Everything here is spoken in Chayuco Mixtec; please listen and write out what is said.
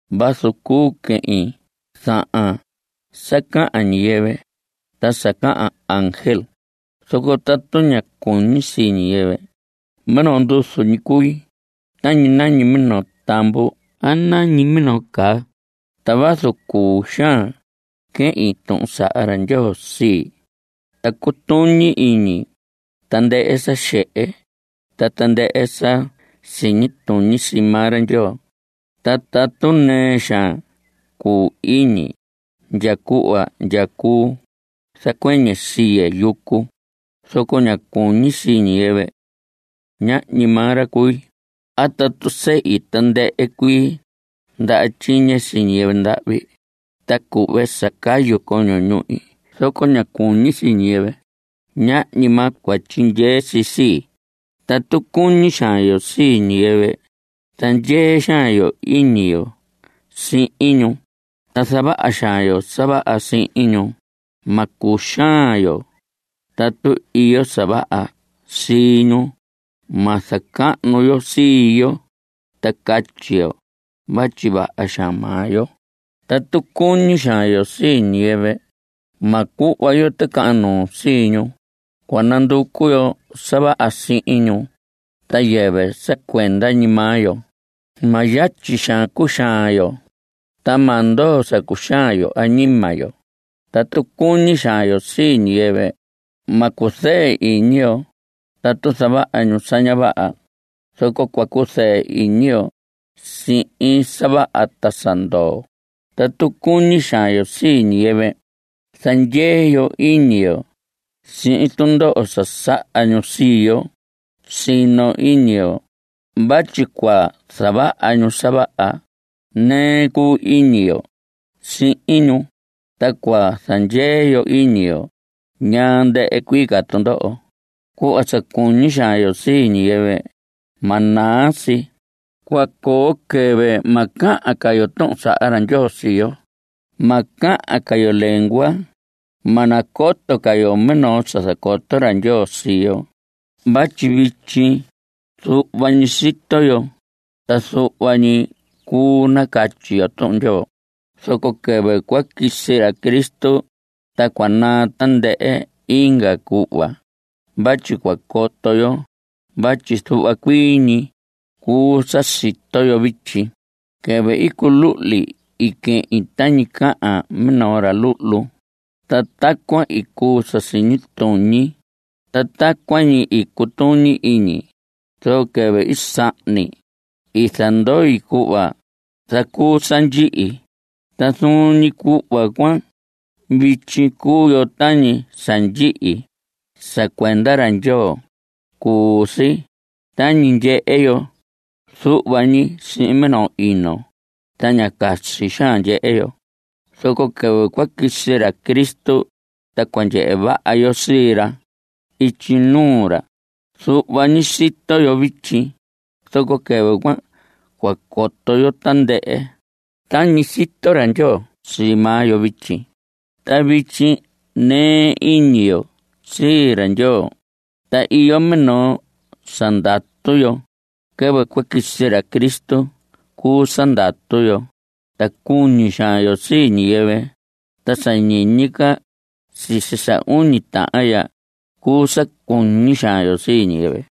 Vazu cuu quehin zahan sa cahan ñiyɨvɨ ta sa cahan ángel, zoco tatu ña cuñi sii ñiyɨvɨ, minoo nduzu ñi cui tañi nañi minoo tamvu a nañi minoo caa. Ta vazu cuu xaan quehin tuhun saha ra Ndyoo sii, ta cutuñi iñi tandɨhɨ sa xehe ta tandɨhɨ sa siñi tuñi sii maa ra Ndyoo, ta tatu nɨɨ xaan cuu iñi ndya cuhva ndya cuu zacuɨñɨ siye yucu zoco ña cuñi sii ñiyɨvɨ, ñahñi maa ra cui. A tatu sehi tandɨhɨ cuii ndaha tyiñe sii ñiyɨvɨ ndahvi ta cuhve sa cayu coño ñuhi zoco ña cuñi sii ñiyɨvɨ, ñahñi maa cua tyindyee si sii. Tatu cuñi xaan yo sii ñiyɨvɨ, zandyee xaan yo iñi yo sihin ñu ta zavaha xaan yo sa vaha sihin ñu. Ma cuxaan yo tatu iyo sa vaha sii ñu. Ma zacahnu yo sii yo ta catyi yo vatyi vaha xaan maa yo. Tatu cuñi xaan yo sii ñiyɨvɨ, ma cuhva yo ticahan nuu sii ñu. Cua nanducu yo sa vaha sii ñu ta yɨvɨ sa cuenda ñi maa yo. Ma yatyi xaan cuxaan yo. Ta ma ndoo sa cuxaan yo añima yo. Tatu cuñi xaan yo sii ñiyɨvɨ, ma cuzɨɨ iñi yo tatu zavaha ñu sa ña vaha, zoco cua cuzɨɨ iñi yo sihin sa vaha ta sa ndoo. Tatu cuñi xaan yo sii ñiyɨvɨ, zandyee yo iñi yo sihin tundoho sa saha ñu sii yo; sino iñi yo vatyi cua zavaha ñu sa vaha; nɨɨ cuu iñi yo sii ñu. Ta cua zandyee yo iñi yo ñaa ndɨhɨ cuii ca tundoho. Cuhva sa cuñi xaan yo sii ñiyɨvɨ ma naa si. Cua coo quɨvɨ ma cahan ca yo tuhun saha ra Ndyoo sii yo. Ma cahan ca yo lengua. Ma nacoto ca yo minoo sa zacoto ra Ndyoo sii yo. Vatyi vityi zuhva ñi sito yo, ta zuhva ñi cuu nacatyi yo Tuhun Ndyoo. Zoco quɨvɨ cua quisi ra Cristo ta cua naa tandɨhɨ inga cuhva cuan vatyi cua coto yo vatyi zuhva cuii ñi cuu sa sito yo vityi. Quɨvɨ i culuhli i quehin tañi cahan minoo ra luhlu, ta tacuan i cuu sa siñi tuñi, ta tacuan ñi i cutuñi iñi. Zoco quɨvɨ i sahni, i zandoi cuhva zacuu sa ndyihi. Ta zuun ñi cuhva cuan vityi, cuu yo tañi sa ndyihi sa cuenda ra Ndyoo. Cuu si tañi ndyehe yo zuhva ñi sihin minoo ino ta ña casi xaan ndyehe yo. Zoco quɨvɨ cua quisi ra Cristo, ta cua ndyehe vaha yo sii ra ityi nuu ra. Zuhva ñi sito yo vityi, zoco quɨvɨ cuan cua coto yo tandɨhɨ tañi sito ra Ndyoo sii maa yo vityi. Ta vityi nɨɨ iñi yo sii ra Ndyoo. Ta iyo minoo sa ndatu yo. Quɨvɨ cua quisi ra Cristo cuu sa ndatu yo. Ta cuñi xaan yo sii ñiyɨvɨ. Ta sa ñiñi ca sisi sa uñi tahan ya cuu sa cuñi xaan yo sii ñiyɨvɨ.